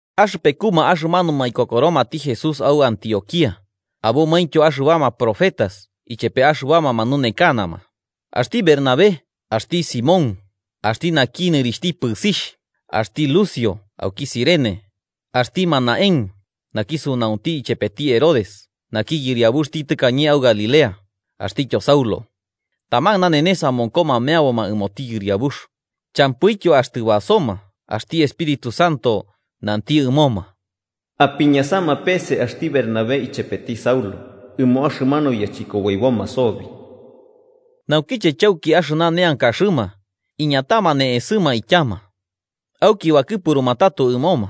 Axɨpekuma axɨmanuma ikokoromati Jesús au Antioquía, abomaintyo axɨbama profetas ichepe axɨbama manunekanama: axti Bernabé, axti Simón, (axti naki nɨrixhtityo “kɨbɨsiti”), axti Lucio auki Cirene, axti Manahén, naki sunaunti ichepeti Herodes naki yɨriabuxti tɨkañe au Galilea, axtityo Saulo. Taman nanenes amonkoma meaboma ɨmoti Yɨriabux, champɨityo axtɨ basoma axti Espíritu Santo nanti ɨmoma: “Apiñasama pese axti Bernabé ichepeti Saulo, ɨmo axɨmanu yachɨkoboiboma sobi.” Naukiche chauki axɨmanu neankaxɨma, iñatama ne'esɨma ityama. Auki bakɨpuruma tato ɨmoma.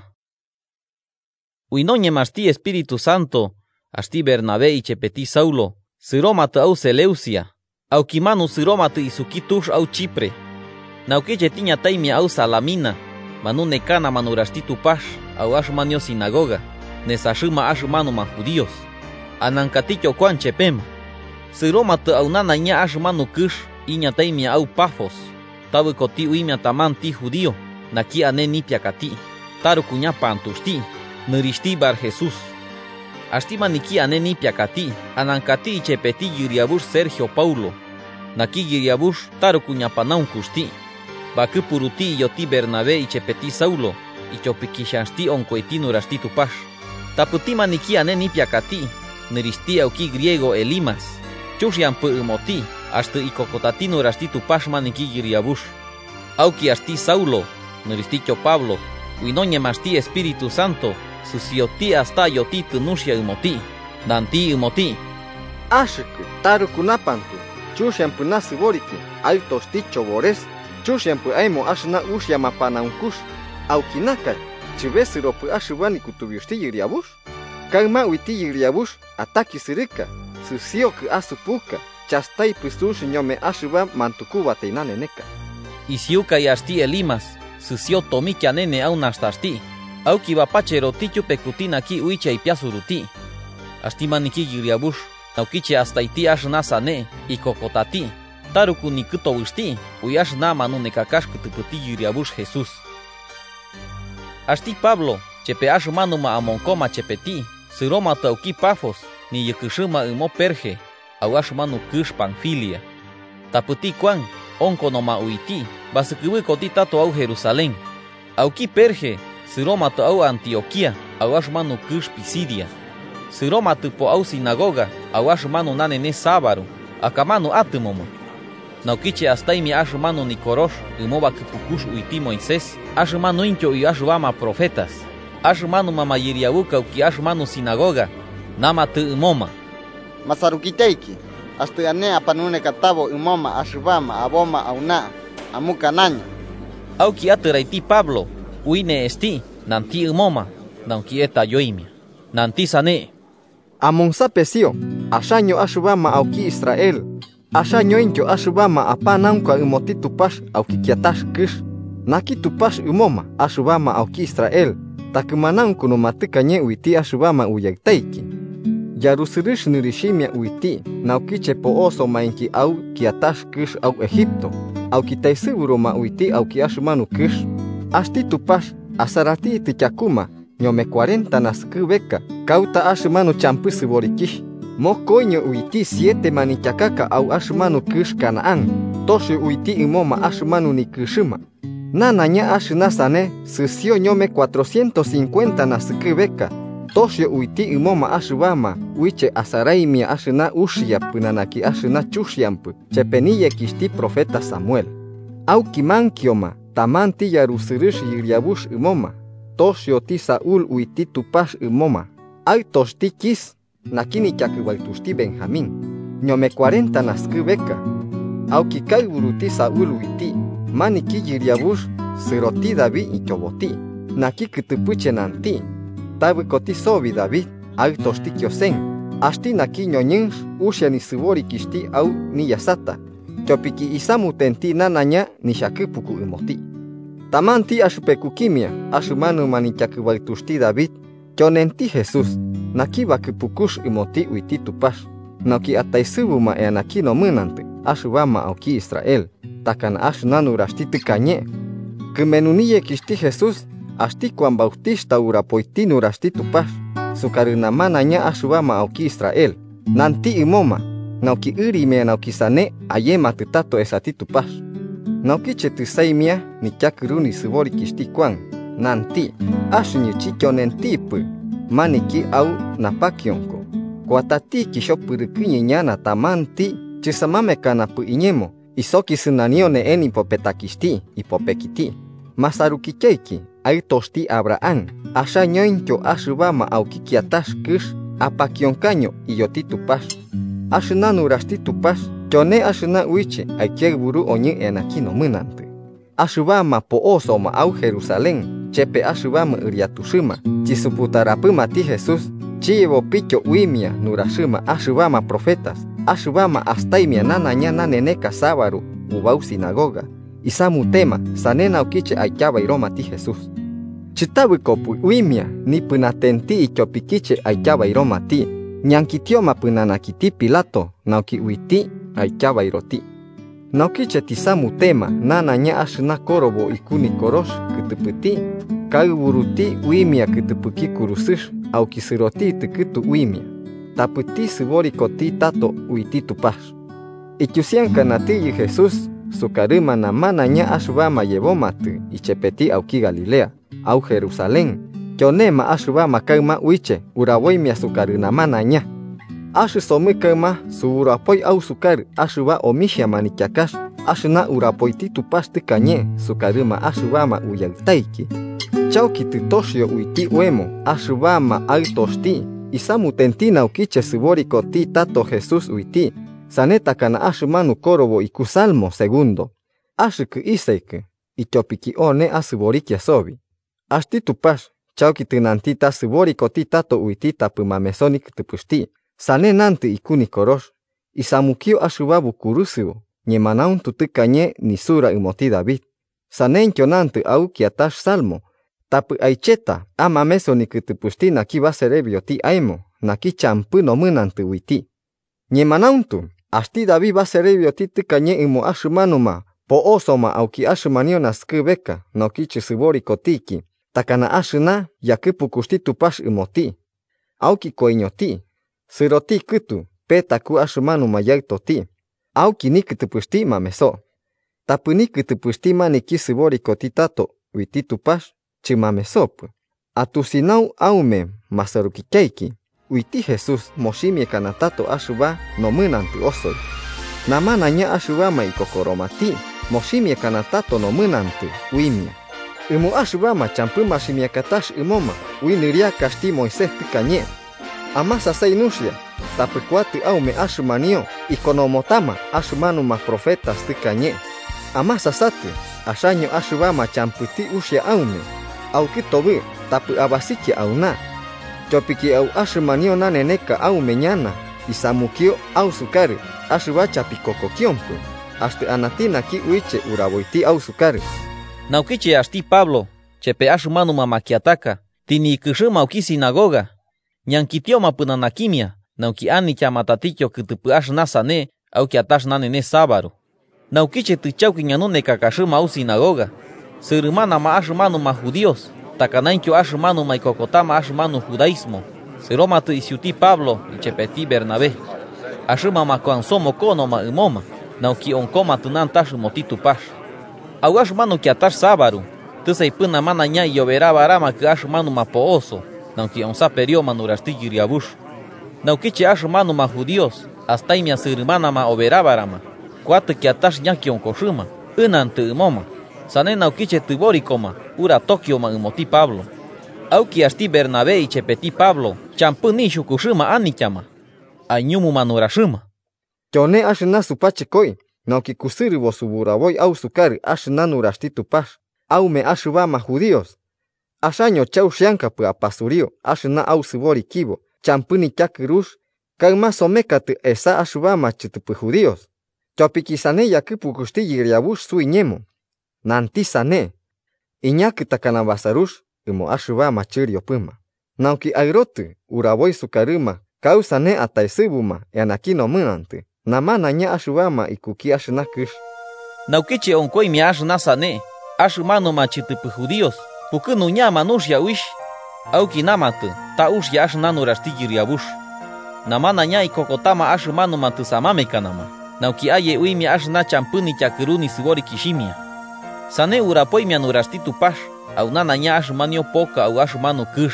Ui noñemaxti Espíritu Santo, axti Bernabé ichepeti Saulo sɨromatɨ au Seleucia, aukimanu sɨromatɨ isuki tux au Chipre. Naukiche tiñataimia au Salamina, manunekanama nuraxti Tupax au axɨmanio sinagoga nesaxɨma axɨmanuma judíos. Anankatityo Kuan chepema. Sɨromatɨ au nanaiña axɨmanu kɨx iñataimia au Pafos, tabɨkoti uimia tamanti judío naki ane nipiakati, taruku ñapantuxti nɨrixhti Barjesús. Axti maniki ane nipiakati anankati ichepeti yɨriabux Sergio Paulo. Naki yɨriabux taruku ñapanaunkuxti. Bakɨpuruti iyoti Bernabé ichepeti Saulo, ityopiki xhanxti onkoiti nuraxti Tupax. Tapɨti maniki ane nipiakati, nɨrixhti auki griego Elimas, chuxiampɨ ɨmoti axtɨ ikokotati nuraxti Tupax maniki yɨriabux. Auki axti Saulo, nɨrixhtityo Pablo, ui noñemaxti Espíritu Santo, sɨsioti astayotitɨ nuxia ɨmoti nanti ɨmoti: –¡Axɨkɨ taruku napantu, chuxiampɨ nasɨboriki, aɨtoxti chobores, chuxiampɨ aemo axɨna uxia mapanaunkux! ¿Auiki naka chɨbesɨropɨ axɨba nikutubiuxti Yɨriabux? Kaɨma uiti Yɨriabux atakisɨrɨka: sɨsiokɨ asupuka chastaipɨ sux ñome axɨba mantukubatai naneneka. Isiukai axti Elimas sɨsio tomikianene au nastaxti, auki bapacheroti tyupekuti naki uiche aipiasuruti. Axti maniki yɨriabux, naukiche astaiti axɨna sane ikokotati, taruku nikɨtobɨxti ui axɨna manunekakax kɨtɨpɨti Yɨriabux Jesús. Axti Pablo chepe axɨmanuma amonkoma chepeti sɨromatɨ auki Pafos niyɨkɨxɨma ɨmo Perge, au axɨmanu kɨx Panfilia. Tapɨti Kuan onkonoma uiti basɨkɨbɨkoti tato au Jerusalén. Auki Perge sɨromatɨ au Antioquía au axɨmanu kɨx Pisidia. Sɨromatɨpo au sinagoga au axɨmanu nanenes sabaru akamanu atɨmoma. Naukiche astaimia axɨmanu Nikorox ɨmo bakɨpukux uiti Moisés axɨmanuintyo ui axɨbama profetas, axɨmanuma mayɨriabuka auki axɨmanu sinagoga namatɨ ɨmoma: –Masarukityaiki, axtɨ ane apanunekatabo ɨmoma axɨbama aboma auna, amukanaño. Auki atɨraiti Pablo, ui ne'esti nanti ɨmoma nauki etayoimia, nanti sane: –Amonsapesio, axaño axɨbama auki Israel, axañointyo axɨbama apanaunka ɨmoti Tupax auki kiatax kɨx. Naki Tupax ɨmoma axɨbama auki Israel, takɨmanaunkunuma tɨkañe uiti axɨbama uyaɨtaiki. Yarusɨrɨx nɨrixhimia uiti naukiche po'osomainki au kiatax kɨx au Egipto, auki taesɨburuma uiti auki axɨmanu kɨx. Axti Tupax asaratitɨ tyakuma ñome cuarenta naskɨbeka kauta axɨmanu champɨ sɨborikixh, mokoiño uiti siete manityakaka au axɨmanu kɨx Canaán, toxio uiti ɨmoma axɨmanu nikɨxɨma. Nanaiña axɨna sane sɨsio ñome cuatrocientos cincuenta naskɨbeka, toxio uiti ɨmoma axɨbama uiche asaraimia axɨna uxia pɨnanaki axɨna chuxiampɨ chepe niyekixhti profeta Samuel. Auki mankioma tamanti yarusɨrɨx yɨriabux ɨmoma, toxioti Saúl uiti Tupax ɨmoma, aɨtoxti Quis, naki nityakɨbaɨtuxti Benjamín, ñome cuarenta naskɨbeka. Auki kaɨburuti Saúl uiti, maniki yɨriabux sɨroti David ityoboti, naki kɨtɨpɨche nanti: ‘Tabɨkoti sobi David, aɨtoxti Kiosen, axti naki ñoñɨnx uxia nisɨborikixhti au niyasata, tyopikik isamutenti nanaiña nixhakɨpuku ɨmoti.’ Tamanti axɨpekukimia axɨmanuma nityakɨbaɨtuxti David tyonenti Jesús, naki bakɨpukux ɨmoti uiti Tupax, nauki ataesɨbuma eanaki nomɨnantɨ axɨbama auki Israel, takana axɨna nuraxti tɨkañe. Kɨmenu niyekixhti Jesús, axti Kuan Bautixhta urapoiti nuraxti Tupax sukarɨ namanaiña axɨbama auki Israel, nanti ɨmoma nauki ɨrimia nauki sane ayematɨ tato esati Tupax. Naukiche tɨsaimia nityakɨru nisɨborikixhti Kuan, nanti: ‘Axɨñɨ chityonentipɨ maniki au napakionko. Kuatatiki xhopɨrɨkɨñɨ ñana tamanti chɨsamamekanapɨ iñemo isokisɨnanio ne'e nipopetakixhti ipopekiti.’ “Masarukityaiki, aɨtoxti Abraham, axañointyo axɨbama auki kiatax kɨx apakionkaño iyoti Tupax: axɨna nuraxti Tupax tyone axɨna uiche aikiaɨburu oñɨ eanaki nomɨnantɨ. Axɨbama po'osoma au Jerusalén chepe axɨbama ɨriatuxɨma, chisuputarapɨmati Jesús, chiyebopityo uimia nuraxɨma axɨbama profetas, axɨba astaimia nanaiña naneneka sabaru ubau sinagoga. Isamutema, sane naukiche aityabairomati Jesús. Chɨtabɨkopɨ uimia nipɨnatenti ityopikiche aityabairomati, ñankitioma pɨnanakiti Pilato nauki uiti aityabairoti. Naukiche tisamutema nanaiña axɨna korobo iku Nikorox kɨtɨpɨti, kaɨburuti uimia kɨtɨpɨki kurusɨx auki sɨroti kɨtu uimia. Tapɨti sɨborikoti tato uiti Tupax. Ityusiankanatiyɨ Jesús sukarɨma namanaiña axɨbama yebomatɨ ichepeti auki Galilea au Jerusalén, tyonema axɨbama kaɨma uiche uraboimia sukarɨ namanaiña. Axɨsomɨ kaɨma suburapoi ausukarɨ axɨba omixhia manityakax, axɨna urapoiti Tupax tɨkañe sukarɨma axɨbama uyaɨtaiki. Chauki tɨtoxio uiti oemo axɨbama aɨtoxti, isamutenti naukiche sɨborikoti tato Jesús uiti, sane takana axɨmanu korobo iku Salmo segundo: ‘Axɨkɨ Isaɨkɨ, ityopiki one asɨborikia sobi.’ Axti Tupax chauki tɨnanti ta sɨborikoti tato uiti tapɨ mameso nikɨtɨpɨxti, sane nantɨ iku Nikorox: ‘Isamukio axɨba bokurusɨo ñemanauntu tɨkañe nisura ɨmoti David.’ Saneityo nantɨ au kiatax Salmo: ‘Tapɨ aicheta amameso nikɨtɨpɨxti naki baserebioti aemo, naki champɨ nomɨnantɨ uiti.’ Ñemanauntu, axti David baserebioti tɨkañe ɨmo axɨmanuma po'oso auki axɨmanio naskɨbeka naukiche sɨborikotiki, takana axɨna yakɨpukuxti Tupax ɨmoti. Auki koiñoti, sɨroti kɨtu petaku axɨmanuma yaɨtoti, auki nikɨtɨpɨxti mameso. Tapɨ nikɨtɨpɨxti maniki sɨborikoti tato uiti Tupax chɨmamesopɨ. Atusinau aume masarukityaiki, uiti Jesús moximiakana tato axɨba nomɨnantɨ osoi. Namanaiña axɨbama ikokoromati moximiakana tato nomɨnantɨ uimia, ɨmo axɨbama champɨ maximiakatax ɨmoma ui nɨriakaxti Moisés tɨkañe. Amasasai nuxia, tapɨ kuatɨ aume axɨmanio ikonomotama axɨmanuma profetas tɨkañe: ‘Amasasatɨ, axaño axɨbama champɨti uxia aume, aukɨtobɨɨ tapɨ abasikia auna. Tyopiki au axɨmanio naneneka aume ñana isamukio ausukarɨ axɨba chapikokokiompɨ, axtɨ anati naki uiche uraboiti ausukarɨ.’” Naukiche axti Pablo chepe axɨmanuma makiataka tɨniyɨkɨxɨma auki sinagoga, ñankitioma pɨnanakimia nauki anityama tatityo kɨtɨpɨ axɨna sane au kiatax nanenes sabaru. Naukiche tɨchauki ñanunekakaxɨma au sinagoga, sɨrɨmanama axɨmanuma judíos takanaintyo axɨmanuma ikokotama axɨmanu judaísmo sɨromatɨ isiuti Pablo ichepeti Bernabé. Axɨma makuansomokonoma ɨmoma nauki onkomatɨ nantax ɨmoti Tupax. Au axɨmanu kiatax sabaru, tɨsaipɨ namanaiña iyoberabaramakɨ axɨmanuma po'oso nauki onsaperioma nuraxti Yɨriabux. Naukiche axɨmanuma judíos astaimia sɨrɨmanama oberabarama, kuatɨ kiatax ñakionkoxɨma ɨnantɨ ɨmoma, sane naukiche tɨborikoma uratokioma ɨmoti Pablo. Auki axti Bernabé ichepeti Pablo champɨ nixhukuxɨma anityama, aiñumuma nuraxɨma: –Tyone axɨna supachɨkoi nauki kusɨrɨbo suburaboi ausukarɨ axɨna nuraxti Tupax, aume axɨbama judíos. Axaño chauxiankapɨ apasuriu axɨna ausɨborikibo champɨ nityakɨrux, kaɨma somekatɨ esa axɨbama chɨtɨpɨ judíos. Tyopiki sane yakɨpukuxti Yɨriabux suiñemo, nanti sane: ‘Iñakɨ takana basarux ɨmo axɨbama chɨriopɨma, nauki aɨrotɨ uraboi sukarɨma kausane ataesɨbuma eanaki nomɨnantɨ namanaiña axɨbama ikuki axɨna kɨx.’ Naukiche onkoimia axɨna sane axɨmanuma chɨtɨpɨ judíos pukɨnuñama nuxia uixh, auki namatɨ ta uxia axɨna nuraxti Yɨriabux. Namanaiña ikokotama axɨmanuma tɨsamamekanama nauki aye uimia axɨna champɨ nityakɨru nisɨborikixhimia. Sane urapoimia nuraxti Tupax au nanaiña axɨmanio poka au axɨmanu kɨx.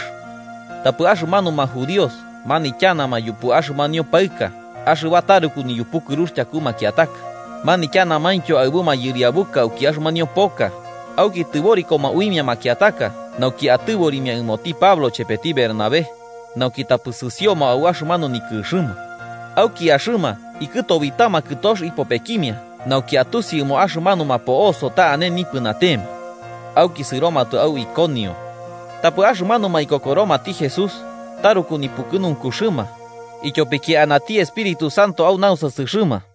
Tapɨ axɨmanuma judíos manityanama yupu axɨmanio paɨka axɨba taruku niyupukɨrux tyaku makiataka, manityanamaintyo aɨbu mayɨriabuka auki axɨmanio poka, auki tɨborikoma uimia makiataka nauki atɨborimia ɨmoti Pablo chepeti Bernabé, nauki tapɨ sɨsioma au axɨmanu nikɨxɨma. Auki axɨma ikɨtobitama kɨtox ipopekimia nauki atusi ɨmo axɨmanuma po'oso ta ane nipɨnatema. Auki sɨromatɨ au Iconio. Tapɨ axɨmanuma ikokoromati Jesús, taruku nipukɨnunkuxɨma, ityopiki anati Espíritu Santo au nausasɨxɨma.